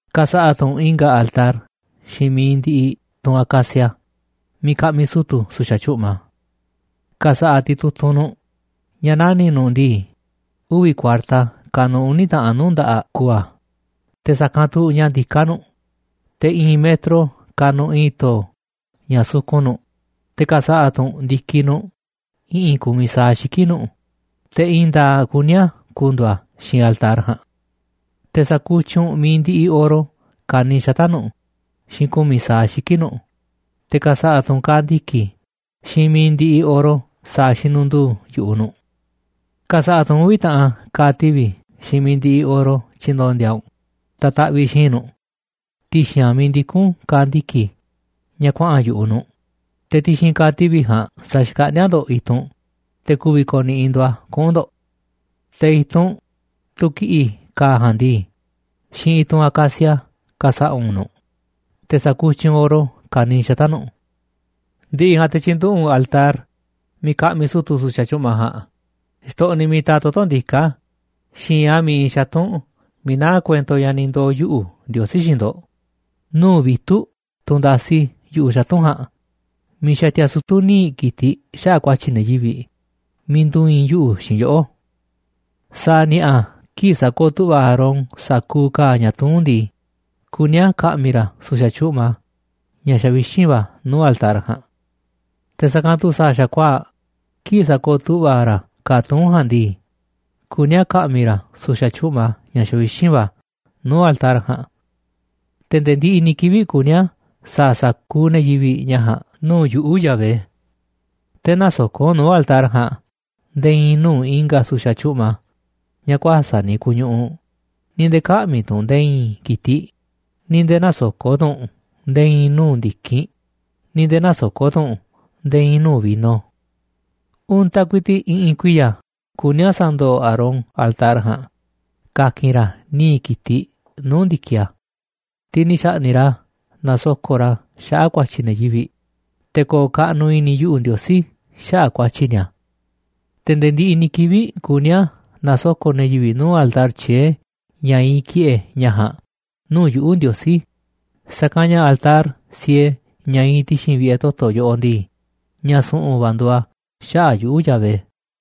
’Ka̱sa̱ꞌa̱ tu̱ u̱nꞌ i̱nga̱ altar xiinꞌ mi̱iꞌ ndiꞌiꞌ tunꞌ acacia miiꞌ ka̱ꞌmi̱ sutu̱ su̱xa̱ tyu̱ꞌma. Ka̱sa̱ꞌa̱ titutunꞌ u̱nꞌ nu̱ꞌ ña̱ nani̱ꞌ nu̱ꞌ ndii, uvi̱ kuarta kanuꞌ uni̱ taꞌan nuu̱ꞌ nda̱ꞌaꞌ ku̱u̱ a̱, te̱ sa̱kanꞌ tu̱ ña̱ ndiká nu̱ꞌ, te̱ i̱i̱n metro kanuꞌ i̱i̱n to̱o̱ ña̱ sukun nu̱ꞌ, te̱ ka̱sa̱ꞌa̱ tu̱ u̱nꞌ ndi̱kiꞌ nu̱ꞌ i̱ꞌi̱n ku̱miꞌ sa̱aꞌ xiki̱ꞌ nu̱ꞌ, te̱ i̱i̱n nda̱a̱ꞌ kuní a̱ ku̱ndu̱u̱ a̱ xiinꞌ altar ja̱a̱nꞌ. Te̱ sa̱kutyiꞌ u̱nꞌ mi̱iꞌ ndiꞌiꞌ oro ka̱niiꞌ xata̱ꞌ nu̱ꞌ xiinꞌ ku̱miꞌ sa̱aꞌ ndi̱kiꞌ nu̱ꞌ, te̱ ka̱sa̱ꞌa̱ tu̱ u̱nꞌ ka̱a̱ ndiki̱ xiinꞌ mi̱iꞌ ndiꞌiꞌ oro sa̱a̱ xinunduu yu̱ꞌuꞌ nu̱ꞌ. Ka̱sa̱ꞌa̱ tu̱ u̱nꞌ uvi̱ taꞌan ka̱a̱ tivi̱ xiinꞌ mi̱iꞌ ndiꞌiꞌ oro tyi̱ndo̱ndi̱a̱ u̱nꞌ ta̱taꞌviꞌ xi̱i̱nꞌ nu̱ꞌ ti̱xi̱n a̱ miiꞌ ndikún ka̱a̱ ndiki̱ ña̱ kuaꞌa̱n yu̱ꞌuꞌ nu̱ꞌ, te̱ ti̱xi̱n ka̱a̱ tivi̱ ja̱a̱nꞌ sa̱xkaꞌndíá ndo̱ꞌ i̱tunꞌ te̱ ku̱vi̱ ko̱ni̱ꞌi̱ ndo̱ꞌ a̱ kuꞌu̱n ndo̱ꞌ. Te̱ i̱tunꞌ, tunꞌ ki̱ꞌi̱ ka̱a̱ ja̱a̱nꞌ ndii, xiinꞌ i̱tunꞌ acacia ka̱sa̱ꞌa̱ u̱nꞌ nu̱ꞌ, te̱ sa̱kutyiꞌ u̱nꞌ oro ka̱niiꞌ xata̱ꞌ nu̱ꞌ. Ndi̱ꞌi̱ ja̱a̱nꞌ te̱ tyi̱nduꞌu̱ꞌ u̱nꞌ altar miiꞌ ka̱ꞌmi̱ sutu̱ su̱xa̱ tyu̱ꞌma ja̱a̱nꞌ xtoꞌniꞌ miiꞌ taaꞌ toto̱ ndiká xi̱i̱nꞌ a̱ miiꞌ iinꞌ xatu̱nꞌ miiꞌ naá kuento ña̱ ni̱ ndoo̱ yuꞌu̱, Ndiosí, xiinꞌ ndo̱ꞌ, nuu̱ꞌ vitu̱ꞌ tunꞌ ndasi yu̱ꞌuꞌ xatu̱nꞌ ja̱a̱nꞌ miiꞌ xatia sutu̱ níiꞌ ki̱tiꞌ xaꞌa̱ꞌ ku̱a̱tyi̱ ne̱ yivi̱ꞌ, miiꞌ ndu̱i̱i̱n yuꞌu̱ xiinꞌ yoꞌó. Sa̱a̱ ni̱a̱ꞌa̱ kii̱ꞌ sa̱kooꞌ tu̱ꞌva̱ Aarón sa̱kuuꞌ ka̱a̱ ña̱ tuún ndii, kuní a̱ ka̱ꞌmi̱ ra̱ su̱xa̱ tyu̱ꞌma ña̱ xavixínꞌ va̱ nuu̱ꞌ altar ja̱a̱nꞌ. Te̱ sa̱kanꞌ tu̱ sa̱a̱ xa̱kuaa̱ꞌ kii̱ꞌ sakooꞌ tu̱ꞌva̱ ra̱ ka̱a̱ tuún ja̱a̱nꞌ ndii, kuní a̱ ka̱ꞌmi̱ ra̱ su̱xa̱ tyu̱ꞌma ña̱ xavixínꞌ va̱ nuu̱ꞌ altar ja̱a̱nꞌ. Te̱ nde̱e̱ ndiꞌiꞌ ni̱ kivi̱ꞌ kuní a̱ sa̱a̱ sa̱kuuꞌ ne̱ yivi̱ꞌ ña̱ ja̱a̱nꞌ nuu̱ꞌ yuꞌu̱, Yahvé. Te̱ nä̱soko̱ꞌ u̱nꞌ nuu̱ꞌ altar ja̱a̱nꞌ nde̱e̱ i̱i̱n nuu̱ꞌ i̱nga̱ su̱xa̱ tyu̱ꞌma ña̱ kuäsa̱ꞌ ni̱ ku̱u̱ ñuꞌuꞌ, ni̱ nde̱e̱ kä̱ꞌmi̱ tu̱ u̱nꞌ nde̱e̱ i̱i̱n ki̱tiꞌ, ni̱ nde̱e̱ nä̱soko̱ꞌ tu̱ u̱nꞌ nde̱e̱ i̱i̱n nuu̱ꞌ ndi̱kinꞌ, ni̱ nde̱e̱ nä̱soko̱ꞌ tu̱ u̱nꞌ nde̱e̱ i̱i̱n nuu̱ꞌ vino. Untaꞌ ku̱i̱ti̱ꞌ i̱ꞌi̱n kuiya̱ kuní a̱ sa̱ndo̱o̱ Aarón altar ja̱a̱nꞌ ka̱ki̱n ra̱ níiꞌ ki̱tiꞌ nuu̱ꞌ ndi̱kiꞌ a̱, tiꞌ ni̱ xa̱ꞌni̱ꞌ ra̱ nasoko̱ꞌ ra̱ xaꞌa̱ꞌ ku̱a̱tyi̱ ne̱ yivi̱ꞌ, te̱ ko̱o̱ kaꞌnuꞌ i̱ni̱ yuꞌu̱, Ndiosí, xaꞌa̱ꞌ ku̱a̱tyi̱ ni̱a̱. Te̱ nde̱e̱ ndiꞌiꞌ ni̱ kivi̱ꞌ kuní a̱ na̱soko̱ꞌ ne̱ yivi̱ꞌ nuu̱ꞌ altar tyié ña iinꞌ ki̱ꞌe̱ ña̱ ja̱a̱nꞌ nuu̱ꞌ yuꞌu̱, Ndiosí, sa̱kanꞌ ña̱ altar siee ña̱ iinꞌ ti̱xi̱n vi̱ꞌe̱ toto̱ yoꞌoꞌ ndii, ña̱ su̱ꞌu̱n va̱ nduuꞌ a̱ xaꞌa̱ꞌ yuꞌu̱, Yahvé.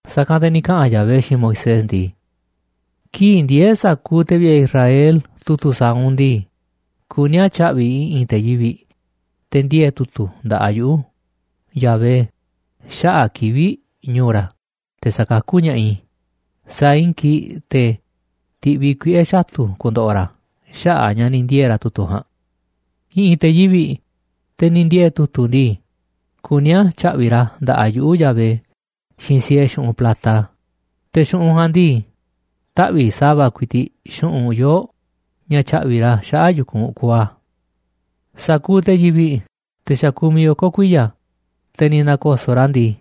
Sa̱kanꞌ te̱ ni̱ kaꞌa̱n ka̱ Yahvé xiinꞌ Moisés ndii: ―Kii̱ꞌ ndiee̱ sa̱kuuꞌ te̱ vi̱ꞌe̱ Israel tu̱tu̱ sa̱a̱ u̱nꞌ ndii, kuní a̱ tya̱ꞌvi̱ i̱ꞌi̱n te̱ yivi̱ꞌ, te̱ ndiee̱ tu̱tu̱ nda̱ꞌaꞌ yuꞌu̱, Yahvé, xaꞌa̱ꞌ kivi̱ꞌ ñu̱u̱ ra̱ te̱ sa̱kakú ña̱ꞌaꞌ i̱, saa̱ꞌ i̱i̱n kii̱ꞌ te̱ ti̱ꞌviꞌ i̱ kuiꞌe̱ xatu̱ ku̱ndo̱ꞌo̱ ra̱ xaꞌa̱ꞌ a̱ ña̱ ni̱ ndiee̱ ra̱ tu̱tu̱ ja̱a̱nꞌ. I̱ꞌi̱n te̱ yivi̱ꞌ, te̱ ni̱ ndiee̱ tu̱tu̱ ndii, kuní a̱ tya̱ꞌvi̱ꞌ ra̱ nda̱ꞌaꞌ yuꞌu̱, Yahvé, xiinꞌ siee xu̱ꞌunꞌ plata. Te̱ xu̱ꞌunꞌ ja̱a̱nꞌ ndii, taꞌvi̱ꞌ sa̱va̱ ku̱i̱ti̱ꞌ xu̱ꞌunꞌ yoo̱ꞌ ña̱ tyaꞌvi̱ ra̱ xaꞌa̱ꞌ yu̱kunꞌ kuuꞌ a̱. Sa̱kuuꞌ te̱ yivi̱ꞌ, te̱ xa̱ kumiꞌ oko̱ kuiya̱, te̱ ni̱ nako̱so̱ꞌ ra̱ ndii,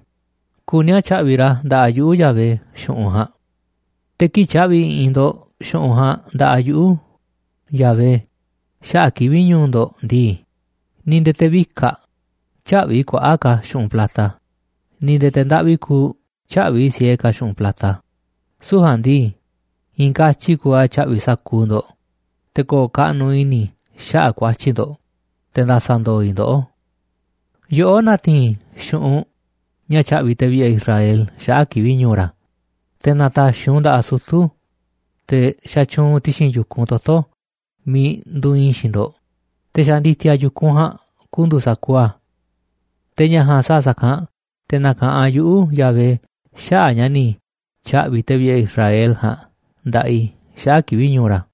kuní a̱ tya̱ꞌvi̱ꞌ ra̱ nda̱ꞌaꞌ yuꞌu̱, Yahvé, xu̱ꞌunꞌ ja̱a̱nꞌ. Te̱ kii̱ꞌ tya̱ꞌvi̱ i̱ꞌi̱n ndo̱ꞌ xu̱ꞌunꞌ ja̱a̱nꞌ nda̱ꞌaꞌ yuꞌu̱, Yahvé, xaꞌa̱ꞌ kivi̱ꞌ ñu̱u̱ ndo̱ꞌ ndii, ni̱ nde̱e̱ te̱ vikaꞌ tyä̱ꞌvi̱ kuaꞌa̱ꞌ ka̱ xu̱ꞌunꞌ plata, ni̱ nde̱e̱ te̱ ndaꞌvi kuuꞌ tyä̱ꞌvi̱ siee ka̱ xu̱ꞌunꞌ plata. Süu̱ꞌ ja̱a̱nꞌ ndii, i̱i̱n katyi kuuꞌ a̱ tya̱ꞌvi̱ sa̱kuuꞌ ndo̱ꞌ te̱ ko̱o̱ kaꞌnu̱ꞌ i̱ni̱ i̱ xaꞌa̱ꞌ ku̱a̱tyi̱ ndo̱ꞌ, te nda̱sa̱ ndo̱o̱ i̱ ndoꞌó. Yoꞌó na̱ti̱i̱n xu̱ꞌunꞌ ña̱ tya̱ꞌvi̱ te̱ vi̱ꞌe̱ Israel xaꞌa̱ꞌ kivi̱ꞌ ñu̱u̱ ra̱, te̱ na̱ta̱xi̱ u̱nꞌ u̱nꞌ nda̱ꞌaꞌ sutu̱, te̱ xatyuunꞌ ti̱xi̱n yu̱kunꞌ toto̱ miiꞌ nduuꞌ iinꞌ i̱ xiinꞌ ndo̱ꞌ, te̱ xa̱ ndi̱ti̱a̱ yu̱kunꞌ ja̱a̱nꞌ ku̱ndu̱u̱ sa̱kuuꞌ a̱. Te̱ ña̱ ja̱a̱nꞌ sa̱a̱ sa̱kanꞌ te̱ na̱ka̱ꞌanꞌ yuꞌu̱, Yahvé, xaꞌa̱ꞌ ña̱ ni̱ tya̱ꞌvi̱ te̱ vi̱ꞌe̱ Israel ja̱a̱nꞌ nda̱ꞌaꞌ i̱ xaꞌa̱ꞌ kivi̱ꞌ ñu̱u̱ ra̱.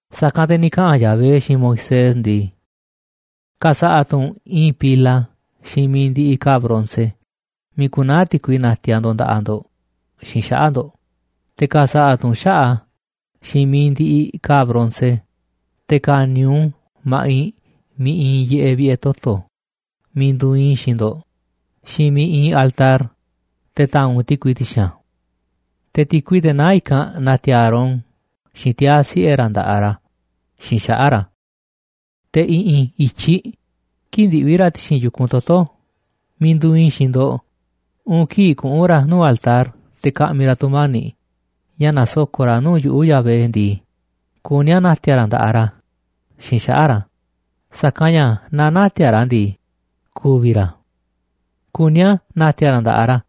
Sa̱kanꞌ te̱ ni̱ kaꞌa̱n ka̱ Yahvé xiinꞌ Moisés ndii: ―Ka̱sa̱ꞌa̱ tu̱ u̱nꞌ i̱i̱n pila xiinꞌ mi̱iꞌ ndiꞌiꞌ ka̱a̱ bronce miiꞌ ku̱naa̱ ti̱kui na̱ti̱a̱ ndo̱ꞌ nda̱ꞌaꞌ ndo̱ꞌ xiinꞌ xaꞌa̱ꞌ ndo̱ꞌ, te̱ ka̱sa̱ꞌa̱ tu̱ u̱nꞌ xaꞌa̱ꞌ a̱ xiinꞌ mi̱iꞌ ndiꞌiꞌ ka̱a̱ bronce. Te̱ ka̱ni̱ u̱nꞌ u̱n ma̱ꞌiꞌ miiꞌ iinꞌ yiꞌeꞌ vi̱ꞌe̱ toto̱ miiꞌ nduuꞌ iinꞌ i̱ xiinꞌ ndo̱ꞌ xiinꞌ miiꞌ iinꞌ altar, te̱ ta̱a̱nꞌ u̱nꞌ ti̱kui ti̱xi̱n a̱. Te̱ ti̱kui, teꞌ naá i̱kanꞌ, na̱ti̱a̱ Aarón xiinꞌ tiaa̱ siꞌe̱ ra̱ nda̱ꞌaꞌ ra̱ xiinꞌ xaꞌa̱ꞌ ra̱. Te̱ i̱ꞌi̱n i̱tyiꞌ kii̱ꞌ ndiꞌvi̱ ra̱ ti̱xi̱n yu̱kunꞌ toto̱ miiꞌ nduuꞌ iinꞌ i̱ xiinꞌ ndo̱ꞌ uun kii̱ꞌ kuꞌu̱n ra̱ nuu̱ꞌ altar te̱ ka̱ꞌmi̱ ra̱ tu̱mani̱ꞌ ña̱ nasoko̱ꞌ ra̱ nuu̱ꞌ yuꞌu̱, Yahvé, ndii, kuní a̱ na̱ti̱a̱ ra̱ nda̱ꞌaꞌ ra̱ xiinꞌ xaꞌa̱ꞌ ra̱, sa̱kanꞌ ña̱ naaꞌ nä̱ti̱a̱ ra̱ a̱ ndii, ku̱vi̱ ra̱. Kuní a̱ na̱ti̱a̱ ra̱ nda̱ꞌaꞌ ra̱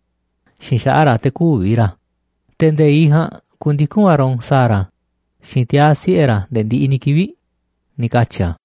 xiinꞌ xaꞌa̱ꞌ ra̱ te̱ kü̱vi̱ ra̱, te̱ nde̱iꞌ ja̱a̱nꞌ ku̱ndiku̱n Aarón sa̱a̱ ra̱ xiinꞌ tiaa̱ siꞌe̱ ra̱ nde̱e̱ ndiꞌiꞌ ni̱ kivi̱ꞌ ―ni̱ katyi̱ a̱.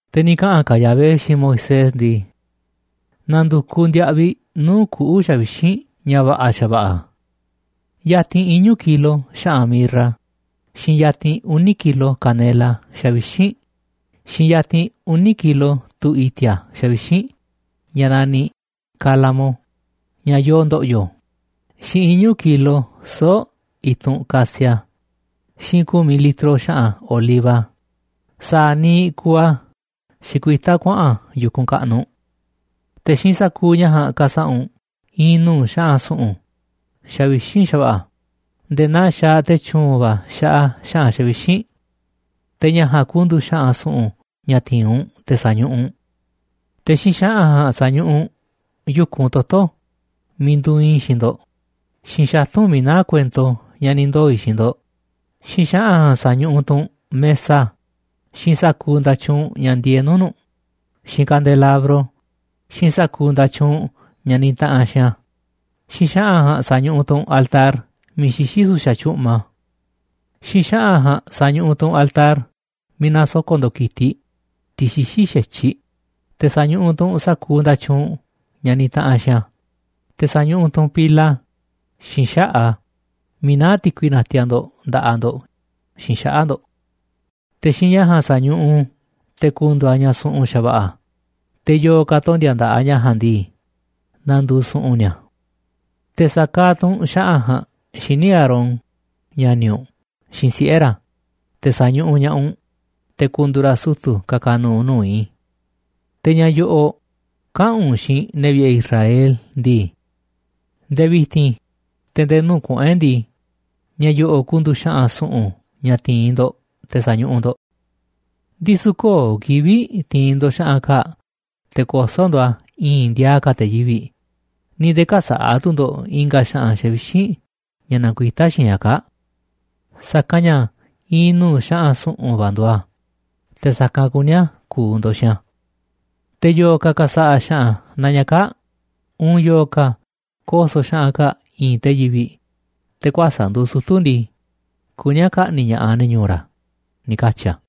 Te̱ ni̱ kaꞌa̱n ka̱ Yahvé xiinꞌ Moisés ndii: ―Na̱ndu̱kuꞌ ndiaꞌviꞌ nuu̱ꞌ kuꞌu̱ xavixínꞌ ña̱ va̱ꞌa̱ xa̱va̱ꞌa̱: yatinꞌ iñu̱ kilo xa̱ꞌa̱n mirra, xiinꞌ yatinꞌ uni̱ kilo canela xavixínꞌ, xiinꞌ yatinꞌ uni̱ kilo tu̱ i̱ti̱a̱ xavixínꞌ ña̱ naniꞌ calamo, ña̱ yoo ndo̱ꞌyo̱, xiinꞌ iñu̱ kilo soo̱ꞌ i̱tunꞌ casia, xiinꞌ ku̱miꞌ litro xa̱ꞌa̱n oliva sa̱a̱ niiꞌ kuuꞌ a̱ xikuitá kuaꞌa̱n yu̱kunꞌ kaꞌnuꞌ. Te̱ xiinꞌ sa̱kuuꞌ ña̱ ja̱a̱nꞌ ka̱sa̱ꞌa̱ u̱nꞌ i̱i̱n nuu̱ꞌ xa̱ꞌa̱n su̱ꞌu̱n xavixínꞌ xa̱va̱ꞌa̱ nde̱e̱ naa xaaꞌ te̱ tyu̱u̱n va̱ xaꞌa xa̱ꞌa̱n xavixínꞌ. Te̱ ña̱ ja̱a̱nꞌ ku̱ndu̱u̱ xa̱ꞌa̱n su̱ꞌu̱n ña̱ ti̱i̱n u̱nꞌ te̱ sa̱ñuꞌuꞌ u̱nꞌ. Te̱ xiinꞌ xa̱ꞌa̱n ja̱a̱nꞌ sa̱ñuꞌuꞌ u̱nꞌ yu̱kunꞌ toto̱ miiꞌ nduuꞌ iinꞌ i̱ xiinꞌ ndo̱ꞌ, xiinꞌ xatu̱nꞌ miiꞌ naá kuento ña̱ ni̱ ndoo̱ i̱ xiinꞌ ndo̱ꞌ, xiinꞌ xa̱ꞌa̱n ja̱a̱nꞌ sa̱ñuꞌuꞌ tu̱ u̱nꞌ mesa, xiinꞌ sa̱kuuꞌ nda̱tyuunꞌ ña̱ ndieeꞌ nuu̱ꞌ nu̱ꞌ, xiinꞌ kandelabro, xiinꞌ sa̱kuuꞌ nda̱tyuunꞌ ña̱ nitaꞌanꞌ xiinꞌ a̱, xiinꞌ xa̱ꞌa̱n ja̱a̱nꞌ sa̱ñuꞌuꞌ tu̱ u̱nꞌ altar miiꞌ xixí su̱xa̱ tyu̱ꞌma. Xiinꞌ xa̱ꞌa̱n ja̱a̱nꞌ sa̱ñuꞌuꞌ tu̱ u̱nꞌ altar miiꞌ nasoko̱ꞌ ndo̱ꞌ ki̱tiꞌ, tiꞌ xixí xa̱tyiꞌ, te̱ sa̱ñuꞌuꞌ tu̱ u̱nꞌ sa̱kuuꞌ nda̱tyuunꞌ ña̱ nitaꞌanꞌ xiinꞌ a̱, te̱ sa̱ñuꞌuꞌ tu̱ u̱nꞌ pila xiinꞌ xaꞌa̱ꞌ a̱ miiꞌ naá ti̱kui natiaꞌ ndo̱ꞌ nda̱ꞌaꞌ ndo̱ꞌ xiinꞌ xaꞌa̱ꞌ ndo̱ꞌ. Te̱ xiinꞌ ña̱ ja̱a̱nꞌ sa̱ñuꞌuꞌ u̱nꞌ u̱n te̱ ku̱ndu̱u̱ a̱ ña̱ su̱ꞌu̱n xa̱va̱ꞌa̱, te̱ yo̱o̱ ka̱ tondi̱a̱ nda̱ꞌaꞌ ña̱ ja̱a̱nꞌ ndii, na̱ndu̱u̱ su̱ꞌu̱n ni̱a̱. ’Te̱ sa̱kaaꞌ tu̱ u̱nꞌ xa̱ꞌa̱n ja̱a̱nꞌ xíniꞌ Aarón, ña̱ni̱ u̱nꞌ, xiinꞌ siꞌe̱ ra̱, te̱ sa̱ñuꞌuꞌ ña̱ꞌaꞌ u̱nꞌ te̱ ku̱ndu̱u̱ ra̱ sutu̱ ka̱ka̱ nu̱u̱ nuu̱ꞌ i̱. Te̱ ña̱ yo̱ꞌo̱ꞌ kaꞌa̱n u̱nꞌ xiinꞌ ne̱ vi̱ꞌe̱ Israel ndii: “Nde̱e̱ vi̱ti̱n, te̱ nde̱e̱ nuu̱ꞌ kuꞌu̱n e̱ꞌ ndii, ña̱ yo̱ꞌo̱ꞌ ku̱ndu̱u̱ xa̱ꞌa̱n su̱ꞌu̱n ña̱ ti̱i̱n ndo̱ꞌ te̱ sa̱ñuꞌuꞌ ndo̱ꞌ. Ndisu̱ köo̱ꞌ kivi̱ꞌ ti̱i̱n ndo̱ꞌ xa̱ꞌa̱n kaa̱ꞌ te̱ koso̱ ndo̱ꞌ a̱ i̱i̱nꞌ ndiaaꞌ ka̱ te̱ yivi̱ꞌ, ni̱ nde̱e̱ kä̱sa̱ꞌa̱ tu̱ ndo̱ꞌ i̱nga̱ xa̱ꞌa̱n xavixínꞌ ña̱ nakuitá xiinꞌ ña̱ kaa̱ꞌ. Sa̱kanꞌ ña̱ i̱i̱n nuu̱ꞌ xa̱ꞌa̱n su̱ꞌu̱n va̱ nduuꞌ a̱, te̱ sa̱kanꞌ kuní a̱ ku̱u̱ ndo̱ꞌ xiinꞌ a̱. Te̱ yo̱o̱ ka̱ ka̱sa̱ꞌa̱ xa̱ꞌa̱n naa ña̱ kaa̱ꞌ uun yo̱o̱ ka̱ koso̱ xa̱ꞌa̱n kaa̱ꞌ i̱i̱nꞌ te̱ yivi̱ꞌ, te̱ kuäsa̱ꞌ nduuꞌ sutu̱ ndii, kuní a̱ ka̱ꞌni̱ꞌ ña̱ꞌaꞌ ne̱ ñu̱u̱ ra̱” ― ni̱ katyi̱ a̱.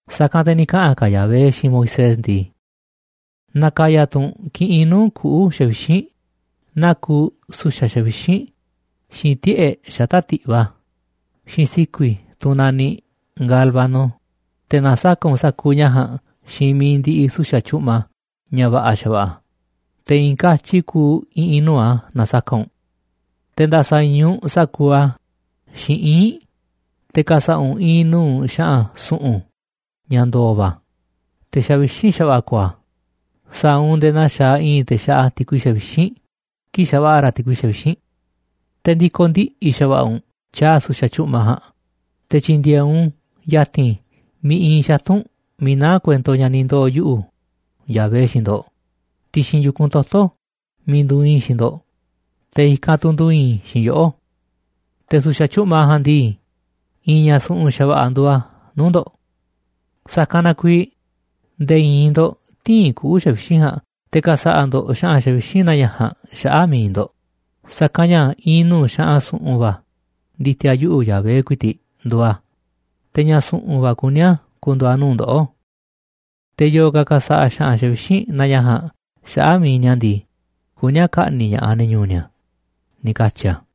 Sa̱kanꞌ te̱ ni̱ kaꞌa̱n ka̱ Yahvé xiinꞌ Moisés ndii: ―Na̱ka̱ya̱ tu̱ u̱nꞌ kiꞌinꞌ nuu̱ꞌ kuꞌu̱ xavixínꞌ, naa kuuꞌ su̱xa̱ xavixínꞌ, xiinꞌ tiꞌe̱ꞌ xata̱ꞌ ti̱ꞌva, xiinꞌ si̱ku̱i̱, tunꞌ naniꞌ gálbano, te̱ na̱saka̱ꞌ u̱nꞌ sa̱kuuꞌ ña̱ ja̱a̱nꞌ xiinꞌ mi̱iꞌ ndiꞌiꞌ su̱xa̱ tyu̱ꞌma ña̱ va̱ꞌa̱ xa̱va̱ꞌa̱, te̱ i̱i̱n katyi kuuꞌ i̱ꞌi̱n nuu̱ꞌ a̱ na̱saka̱ꞌ u̱nꞌ. Te̱ nda̱sa̱i̱i̱n u̱nꞌ sa̱kuuꞌ a̱ xiinꞌ ii̱nꞌ, te̱ ka̱sa̱ꞌa̱ u̱nꞌ i̱i̱n nuu̱ꞌ xa̱ꞌa̱n su̱ꞌu̱n ña̱ ndo̱o̱ va̱, te̱ xavixínꞌ xa̱va̱ꞌa̱ ko̱o̱ a̱. Sa̱a̱ u̱nꞌ nde̱e̱ naa xaaꞌ i̱i̱n te̱ xaꞌa ti̱kui xavixínꞌ kii̱ꞌ xa̱va̱ꞌa̱ ra̱ ti̱kui xavixínꞌ. Te̱ ndi̱ko̱ ndiꞌi̱ xa̱va̱ꞌa̱ u̱nꞌ tyaaꞌ su̱xa̱ tyu̱ꞌma ja̱a̱nꞌ, te̱ tyi̱ndi̱e̱e̱ u̱nꞌ u̱n ya̱ti̱n miiꞌ iinꞌ xatu̱nꞌ miiꞌ naá kuento ña̱ ni̱ ndoo̱ yuꞌu̱, Yahvé, xiinꞌ ndo̱ꞌ, ti̱xi̱n yu̱kunꞌ toto̱ miiꞌ nduuꞌ iinꞌ i̱ xiinꞌ ndo̱ꞌ, te̱ ikanꞌ tu̱ ndu̱i̱i̱n i̱ xiinꞌ yoꞌó. Te̱ su̱xa̱ tyu̱ꞌma ja̱a̱nꞌ ndii, i̱i̱n ña̱ su̱ꞌu̱n xa̱va̱ꞌa̱ nduuꞌ a̱ nuu̱ꞌ ndo̱ꞌ. Sa̱kanꞌ na kuiiꞌ nde̱e̱ i̱i̱n ndo̱ꞌ tï̱i̱n kuꞌu̱ xavixínꞌ ja̱a̱nꞌ te̱ ka̱sa̱ꞌa̱ ndo̱ꞌ xa̱ꞌa̱n xavixínꞌ naa ña̱ ja̱a̱nꞌ xaꞌa̱ꞌ mi̱iꞌ ndo̱ꞌ, sa̱kanꞌ ña̱ i̱i̱n nuu̱ꞌ xa̱ꞌa̱n su̱ꞌu̱n va̱ ndi̱ti̱a̱ yuꞌu̱, Yahvé ku̱i̱ti̱ꞌ, nduuꞌ a̱, te̱ ña̱ su̱ꞌu̱n va̱ kuní a̱ ku̱ndu̱u̱ a̱ nuu̱ꞌ ndoꞌó. Te̱ yo̱o̱ ka̱ ka̱sa̱ꞌa̱ xa̱ꞌa̱n xavixínꞌ naa ña̱ ja̱a̱nꞌ xaꞌa̱ꞌ mi̱iꞌ ni̱a̱ ndii, kuní a̱ ka̱ꞌni̱ꞌ ña̱ꞌaꞌ ne̱ ñu̱u̱ ni̱a̱ ― ni̱ katyi̱ a̱.